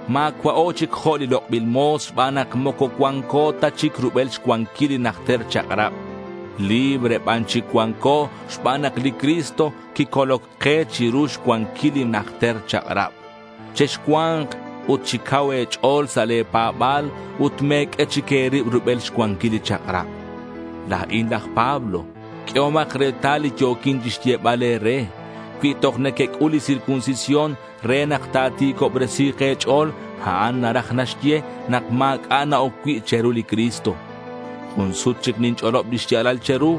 Ma̱cua'o chic jo' li lok'bil mo̱s xban nak moco cuanco ta chic rubel xcuanquil li najter chak'rab. Libre ban chic cuanco xban nak li Cristo quicoloc ke chiru xcuanquil li najter chak'rab. Chexcua̱nk ut chi cau e̱ch'o̱l sa' le̱ pa̱ba̱l ut me̱q'ue chic e̱rib rubel xcuanquil li chak'rab. La̱in laj Pablo. Q'uehomak retal li yo̱quin chixyebal e̱re. Cui toj nequec'ul li circuncisión re nak ta̱ti̱cobresi̱k e̱ch'o̱l, a'an naraj naxye nak ma̱c'a' na-oc cui' che̱ru li Cristo. Jun sut chic ninch'olob li xya̱lal che̱ru.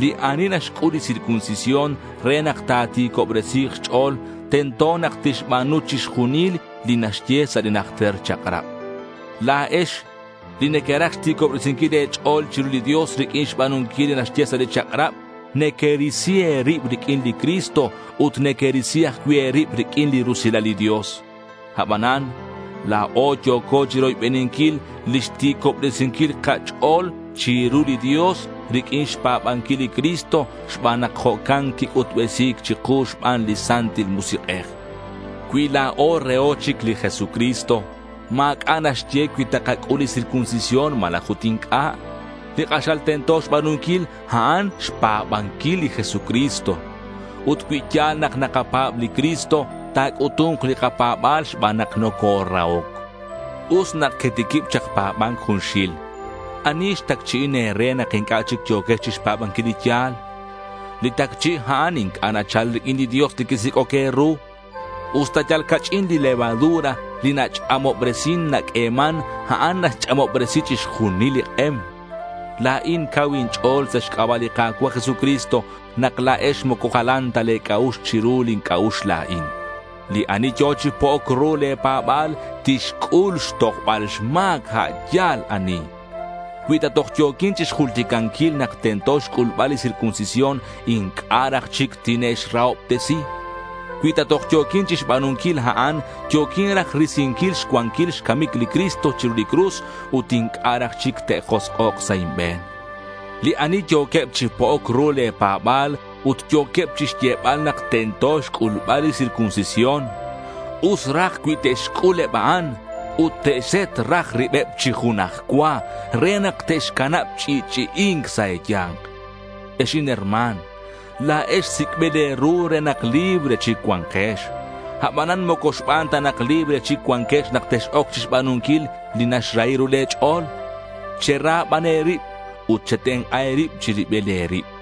Li ani naxc'ul li circuncisión re nak ta̱ti̱cobresi̱k xch'o̱l, tento nak tixba̱nu chixjunil li naxye sa' li najter chak'rab. La̱ex li nequeraj xti̱cobresinquil e̱ch'o̱l chiru li Dios riq'uin xba̱nunquil li naxye sa' li chak'rab, nequerisi e̱rib riq'uin li Cristo ut nequerisi ajcui' e̱rib riq'uin li rusilal li Dios. Abanan la̱o yo̱co chiroybeninquil lix ti̱cobresinquil kach'o̱l chiru li Dios riq'uin xpa̱banquil li Cristo xban nak jo'can quic'utbesi̱c chiku xban li Santil Musik'ej. Cui la̱o reho chic li Jesucristo, ma̱c'a' naxye cui takac'ul li circuncisión malaj ut inc'a'. Li k'axal tento xba̱nunquil, a'an xpa̱banquil li Jesucristo. Ut cui ya̱l nak nakapa̱b li Cristo, ta̱c'utu̱nk li kapa̱ba̱l xban nak nocorahoc. Us nak quetiquib chak pa̱ba̱nc junxil. ¿Ani xtacchi'in e̱re nak inc'a' chic yo̱quex chixpa̱banquil li ya̱l? Li tacchi' a'an inc'a' nachal riq'uin li Dios li quisic'oc e̱ru. Usta yal ca'ch'in li levadura li nach'amobresin naq'ueman, a'an naxch'amobresi chixjunil li k'em. La̱in cau inch'o̱l sa' xc'aba' li Ka̱cua' Jesucristo nak la̱ex moco jalan ta le̱ c'a'ux chiru lin c'a'ux la̱in. Li ani yo̱ chi po'oc ru le̱ pa̱ba̱l tixc'ul xtojbal xma̱c a' yal ani. Cui ta toj yo̱quin chixjulticanquil nak tento xc'ulbal li circuncisión inc'a' raj chic tine'xrahobtesi. Cui ta toj yo̱quin chixba̱nunquil a'an, yo̱quin raj risinquil xcuanquil xcamic li Cristo chiru li cruz ut inc'a' raj chic te'josk'ok sa' inbe̱n. Li ani yo̱queb chi po'oc ru le̱ pa̱ba̱l ut yo̱queb chixyebal nak tento xc'ulbal li circuncisión, us raj cui te'xc'ul eb a'an ut te'xset raj ribeb chi junaj cua re nak te'xcanab ch'i'ch'i'i̱nc sa' e̱ya̱nk. Ex inherma̱n, la̱ex sic'bil e̱ru re nak libre chic cua̱nkex. Abanan moco xban ta nak libre chic cuanquex nak tex-oc chixba̱nunquil li naxrahi ru le̱ ch'o̱l. Chera ban e̱rib ut chetenk'a e̱rib chi ribil e̱rib.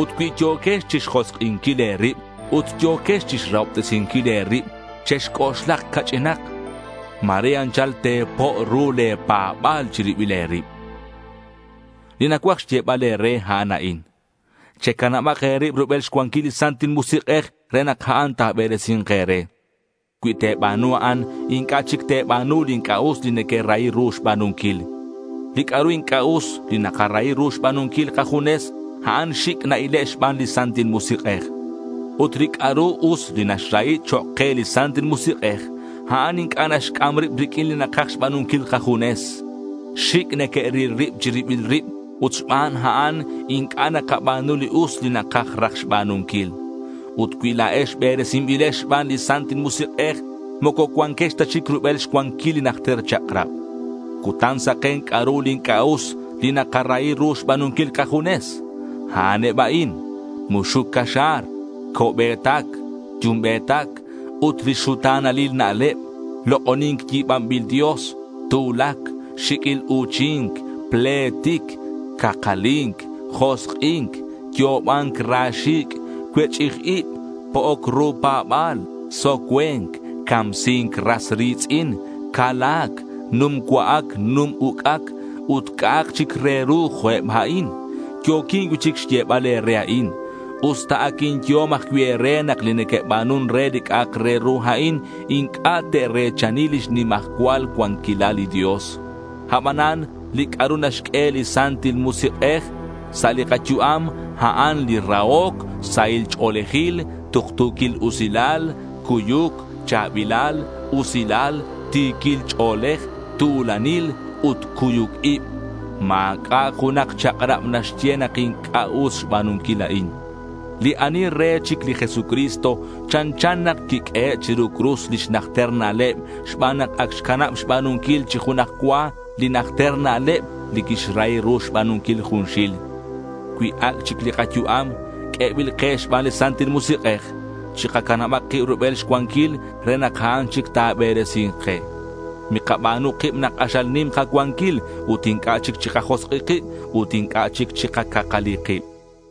Ut cui yo̱quex chixjosk'inquil e̱rib ut yo̱quex chixrahobtesinquil e̱rib, chexc'oxlak ca'ch'inak. Ma̱re anchal te̱po' ru le̱ pa̱ba̱l chi ribil e̱rib. Li nacuaj xyebal e̱re, a'an a'in: Checanabak e̱rib rubel xcuanquil li Santil Musik'ej re nak a'an ta̱beresi̱nk e̱re. Cui te̱ba̱nu a'an, inc'a' chic te̱ba̱nu li inc'a' us li nequerahi ru xba̱nunquil. Li c'a'ru inc'a' us li nakarahi ru xba̱nunquil kajunes, a'an xic' na-ile' xban li Santil Musik'ej. Ut li c'a'ru us li naxrahi chok' ke li Santil Musik'ej, a'an inc'a' naxc'am rib riq'uin li nakaj xba̱nunquil kajunes. Xic' neque'ril rib chi ribil rib ut xban a'an inc'a' nakaba̱nu li us li nakaj raj xba̱nunquil. Ut cui la̱ex beresinbilex xban li Santil Musik'ej, moco cuanquex ta chic rubel xcuanquil li najter chak'rab. Cutan saken c'a'ru li inc'a' us li naka-rahi ru xba̱nunquil kajunes. A'an eb a'in: muxuc caxa̱r, co'be̱tac yumbe̱tac, ut li xuta̱nalil na'leb, lok'oni̱nc yi̱banbil dios, tu̱lac, xi̱q'uil u̱chi̱nc, pletic, cakali̱nc, josk'i̱nc, yo'oba̱nc ra xi̱c', cuech'ij ib, po'oc ru pa̱ba̱l, socue̱nc, camsi̱nc ras ri̱tz'in, cala̱c, num cua'ac num uc'ac, ut c'a'ak chic re ru jo' eb a'in. Yo̱quin cui'chic xyebal e̱re a'in, usta ac inyehom ajcui' e̱re, nak li neque'ba̱nun re li c'a'ak re ru a'in inc'a' te're̱chani lix nimajcual cuanquilal li Dios. Abanan li c'a'ru naxq'ue li Santil Musik'ej sa' li kayu'am, a'an li rahoc, sahil ch'o̱lejil, tuktu̱quil usilal, cuyuc, cha̱bilal, usilal, ti̱quil ch'o̱lej, tu̱lanil ut cuyuc ib. Ma̱c'a' junak chak'rab naxye nak inc'a' us xba̱nunquil a'in. Li ani re chic li Jesucristo, chanchan nak quiq'uehe' chiru cruz lix najter na'leb xban nak ac xcanab xba̱nunquil chi junaj cua li najter na'leb li quixrahi ru xba̱nunquil junxil. Cui ac' chic li kayu'am q'uebil ke xban li Santil Musik'ej, chikacanabak kib rubel xcuanquil re nak a'an chic ta̱beresi̱nk ke. Mikaba̱nu kib nak k'axal nim kacuanquil ut inc'a' chic chikajosk'i kib ut inc'a' chic chikacakali kib.